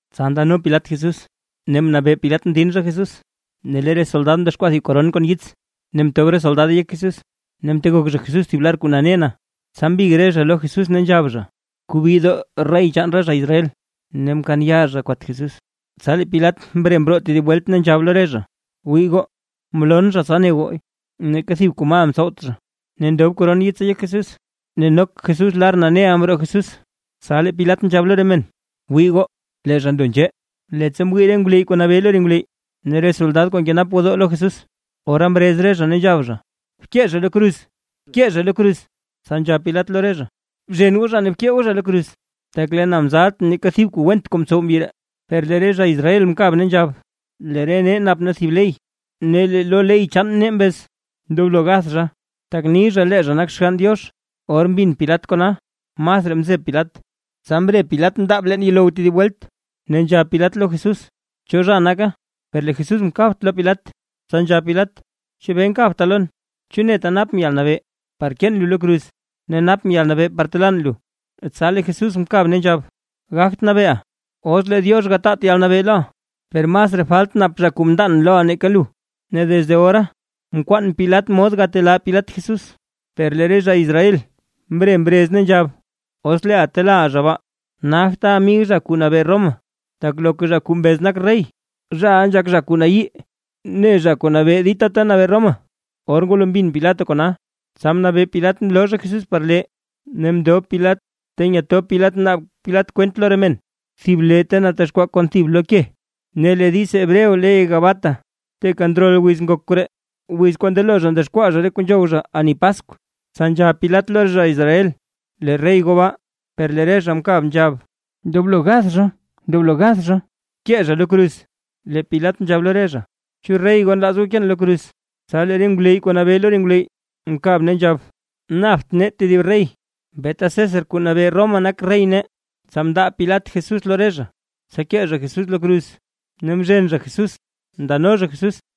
Tsa ndano Pilat Jesús, ne mnabee Pilat mdin zha Jesús. Ne lee re soldad mdexkwaa thib koron kon yits ne mtob re soldade yek Jesús, ne mtegok zha Jesús thib lar kuu nane na. Tsa mbig re zha lo Jesús ne nzhab zha: ―¡Kuubidoo rey chaan re zha Israel! Ne mkaan yaa zha kwat Jesús. Tsa lee Pilat mre mroo tedib welt, ne nzhab lo re zha: ―Wii goo, mloon zha tsa ne goo, neeka thib kuu mal mtsowt zha. Ne ndob koron yitsa yek Jesús ne nok Jesús lar naneʼa mroo Jesús. Tsa lee Pilat nzhab lo re men: ―¡Wii goo, lee zha ndo nzhee! Leettsa mwii re ngwleyy kuu nabee lo re ngwleyy ne re soldad kuu nkenap gwodoo lo Jesús, ora mrez re zha ne nzhab: ―¡Bkee zha lo kruz! ¡Bkee zha lo kruz! Tsa nzhab Pilat lo re zha: ―Bzhen goo zha ne bkee goo zha lo kruz, tak lee na mzaltʼn neeka thib kuu went kuu mtsow mbyi ree. Per lee re zha Israel mkab ne nzhab: ―Lee re nee nap nee thib ley, ne lee lo ley chaan nee mbez ndoblo gath zha, tak ni zha lee zha nak Xgann Diox. Or mbin Pilat kona masraa mzeb Pilat. Tsa mre Pilat mndaab leen yuulow tedib welt, ne nzhab Pilat lo Jesús: ―¿Cho zha naka? Per lee Jesús mkabt lo Pilat. Tsa nzhab Pilat: ―¿Chebee nkabta lon? ¿Chu neta napʼn yalnabee par keen lu lo kruz ne napʼn yalnabee par telaan lu? Tsa lee Jesús mkab ne nzhab: ―Gagt nabeeʼa, os lee Diox gataat yalnabee loʼa; per masraa falt nap zha kuu mndaan loʼa nake lu. Ne desde ora mkwaan Pilat mod par gatelaa Pilat Jesús; per lee re zha Israel mre mrez ne nzhab: ―¡Os leeʼa telaaʼa zha baa, nagta amig zha kuu nabee Roma! ¡Tak loka zha kuu mbez nak rey, zhaʼa nzhak zha kuu nayii ne zha kuu nabee dita ta nabee Roma! Or ngwalo mbin Pilat kona; tsa mnabee Pilat mloo zha Jesús par lee ne mndob Pilat ta nyetob Pilat naab Pilat kwent lo re men, thib lee ta natexkwaa kon thib lo ke; ne lee diiz hebreo ley Gabata. Teeka ndrol wiz ngok koree, wiz kuu ndelo zha ndexkwaa zha re kuu par ani Paskw. Tsa nzhab Pilat lo re zha Israel: ―¡Lee rey goo baa! Per lee re zha mkab nzhab: ―¡Ndoblo gath zha! ¡Ndoblo gath zha! ¡Bkee zha lo kruz! Lee Pilat nzhab lo re zha: ―¿Chu rey goo nlaaz goo keen lo kruz? Tsa lee re ngwleyy kuu nabee lo re ngwleyy, mkab ne nzhab: ―¡Napt nee tedib rey, beeta César kuu nabee Roma nak rey nee! Tsa mndaa Pilat Jesús lo re zha, tsa kee zha Jesús lo kruz, ne mzhen zha Jesús ndano zha Jesús.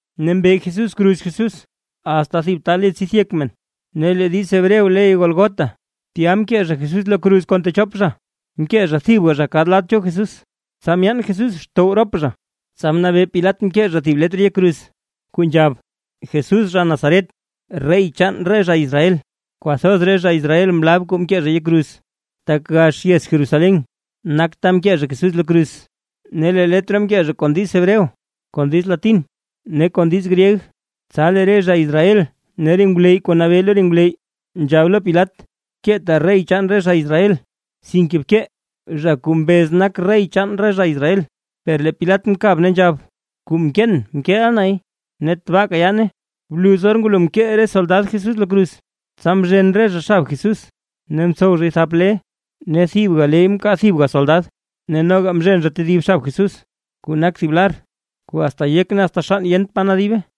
Ne mbe Jesús kruz Jesús asta thib ta le tsidth yek men, (ne lee diiz Hebreo ley Gólgota). Tya mkee zha Jesús lo kruz kon techop zha, mkee zha thibga kad lad cho Jesús tsa myaan Jesús xtow rop zha. Tsa mnabee Pilat mkee zha thib letr yek kruz, kuu nzhab: “JESÚS ZHA NAZARET, REY CHAAN RE ZHA ISRAEL”. Kwathoz re zha Israel mlab kuu mkee zha yek kruz, tak gax yez Jerusalén nak ta mkee zha Jesús lo kruz, ne lee letr mkee zhay kon diiz Hebreo, kon diiz Latín ne kon diiz gryeg. Tsa lee re zha Israel ne re ngwleyy kuu nabee lo re ngwleyy; nzhab lo Pilat: ―Keeta: “Rey chaan re zha Israel”, sinke bkee: “Zha kuu mbez nak rey chaan re zha Israel”. Per lee Pilat mkab ne nzhab: ―Kuu mkeen, mkeeʼa nay ne tabaaka yaane. Bluz or ngwalo mkee re soldad Jesús lo kruz, tsa mzhen re zha xab Jesús, ne mtsow zhay thap le, ne thibga ley mkaa thibga soldad. Ne noga mzhen zha tedib xab Jesús, kuu nak thib lar kuu asta yek ne asta xann yent pa nadibe.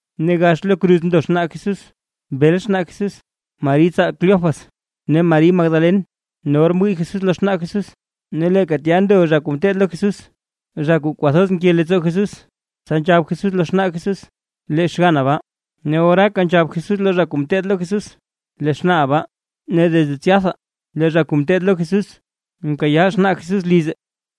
Ne gax lo kruz ndo xnaa Jesús, bel xnaa Jesús, Mari tsaal Cleofas ne Mari Magdalen. Ne or mwii Jesús lo xnaa Jesús, ne leeka tya ndo zha kuu mteed lo Jesús zha kuu kwathoz nke leettsoo Jesús, tsa nzhab Jesús lo xnaa Jesús: ―Lee xganna baa. Ne oraaka nzhab Jesús lo zha kuu ngeteed lo Jesús: ―Lee xnaaʼa baa. Ne desde tsyatha lee zha kuu mteed lo Jesús mkayaa xnaa Jesús lize.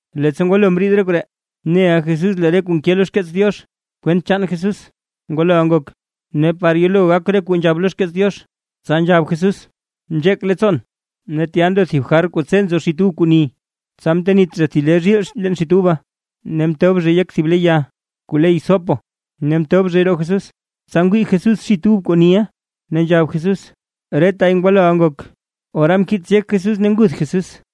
Leettsa ngwalo mriid re koree, neʼa Jesús lee re kuu nke lo xkeets Diox kwent Jesús ngwaloʼa ngok, ne par yelo gak re kuu nzhab lo xkeets Diox, tsa nzhab Jesús: ―Nzheek leettsoon. Ne tya ndo thib jar kuu tse nzo xit ub kuu ni; tsa mtenit zha thib le zhiil leen xit uba, ne mtob zhay yek thib lee ya kuu le hisopo, ne mtob zhay roo Jesús. Tsa ngwii Jesús xit ub kuu niʼa ne nzhab Jesús: ―¡Retay ngwaloʼa ngok! Ora mkiits yek Jesús ne nguth Jesús.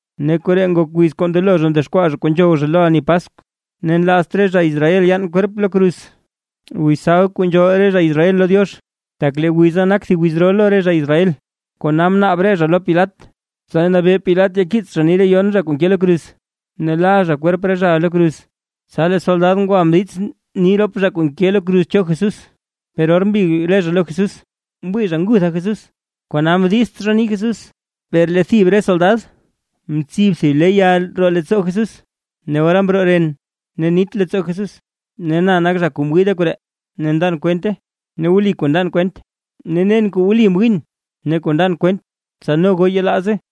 Re koree ngok wiz kuu ndelo zha ndexkwaa zha kuu wu zha lo ani Paskw, ne nlaazt re zha Israel yaan re kwerp lo kruz, wiz sabd kuu nzhool re zha Israel lo Diox, tak lee wiza nak thib wiz ro lo re zha Israel, kona mnaab re zha lo Pilat, tsa nabee Pilat yakiits zha nii re yon zha kuu nke lo kruz ne la zha re kwerp re zhaʼa lo kruz. Tsa lee re soldad ngwa mdiizts nii rop zha kuu mke lo kruz cho Jesús. Per or mbig re zha lo Jesús, mwii zha ngutha Jesús, kona mdiizts zha nii Jesús: Per lee thib re soldad mtsib thib le ya roo leettsoo Jesús ne ora mroo ren ne nit leettsoo Jesús. Ne na nak zha kuu mwii re koree ne ndan kwente, ne wli kuu ndan kwent; ne nen wli kuu mwiin ne kuu ndan kwent; tsa no goo yelaaze.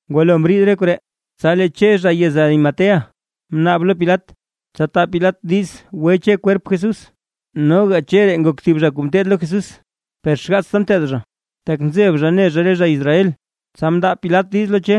Ngwalo mriid re koree, tsa lee Che zha yez Arimatea, mnaab lo Pilat, tsa taa Pilat diiz gwe Che kwerp Jesús. Noga Che ree nak thib zha kuu mteed lo Jesús, per xgaatsta nteed zha, tak nzeb zha ne zha re zha Israel. Tsa mndaa Pilat diiz lo Che,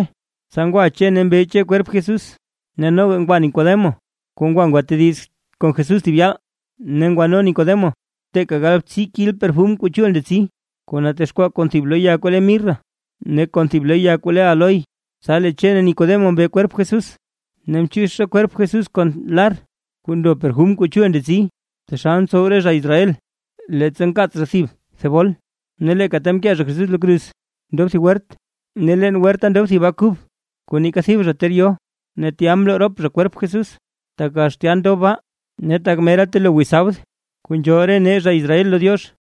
tsa ngwa Che ne mbe Che kwerp Jesús. Ne noga ngwa Nicodemo kuu ngwa gwatediz kon Jesús thib yaal, ne ngwano Nicodemo teeka galbtsii kil perfum kuu chul ndetsi, kuu natexkwaa kon thib lo ya kuu le mirra, ne kon thib lo ya kuu le áloe. Tsa lee Che rop Nicodemo mbe kwerp Jesús, ne mchiix zha kwerp Jesús kon lar kuu ndo perfum kuu chul ndetsi, taxal ntsow re zha Israel leettsa nkaats zha thib thebol. Ne leeka ta mkee zha Jesús lo kruz, ndob thib wert, ne leen werta ndob thib baa kuu kub, kuu neeka thib zha ter yo. Ne tya mloo rop zha kwerp Jesús, tak gax tya ndob baa, ne tak mera telo wiz sabd kuu nzhool re nee zha Israel lo Diox.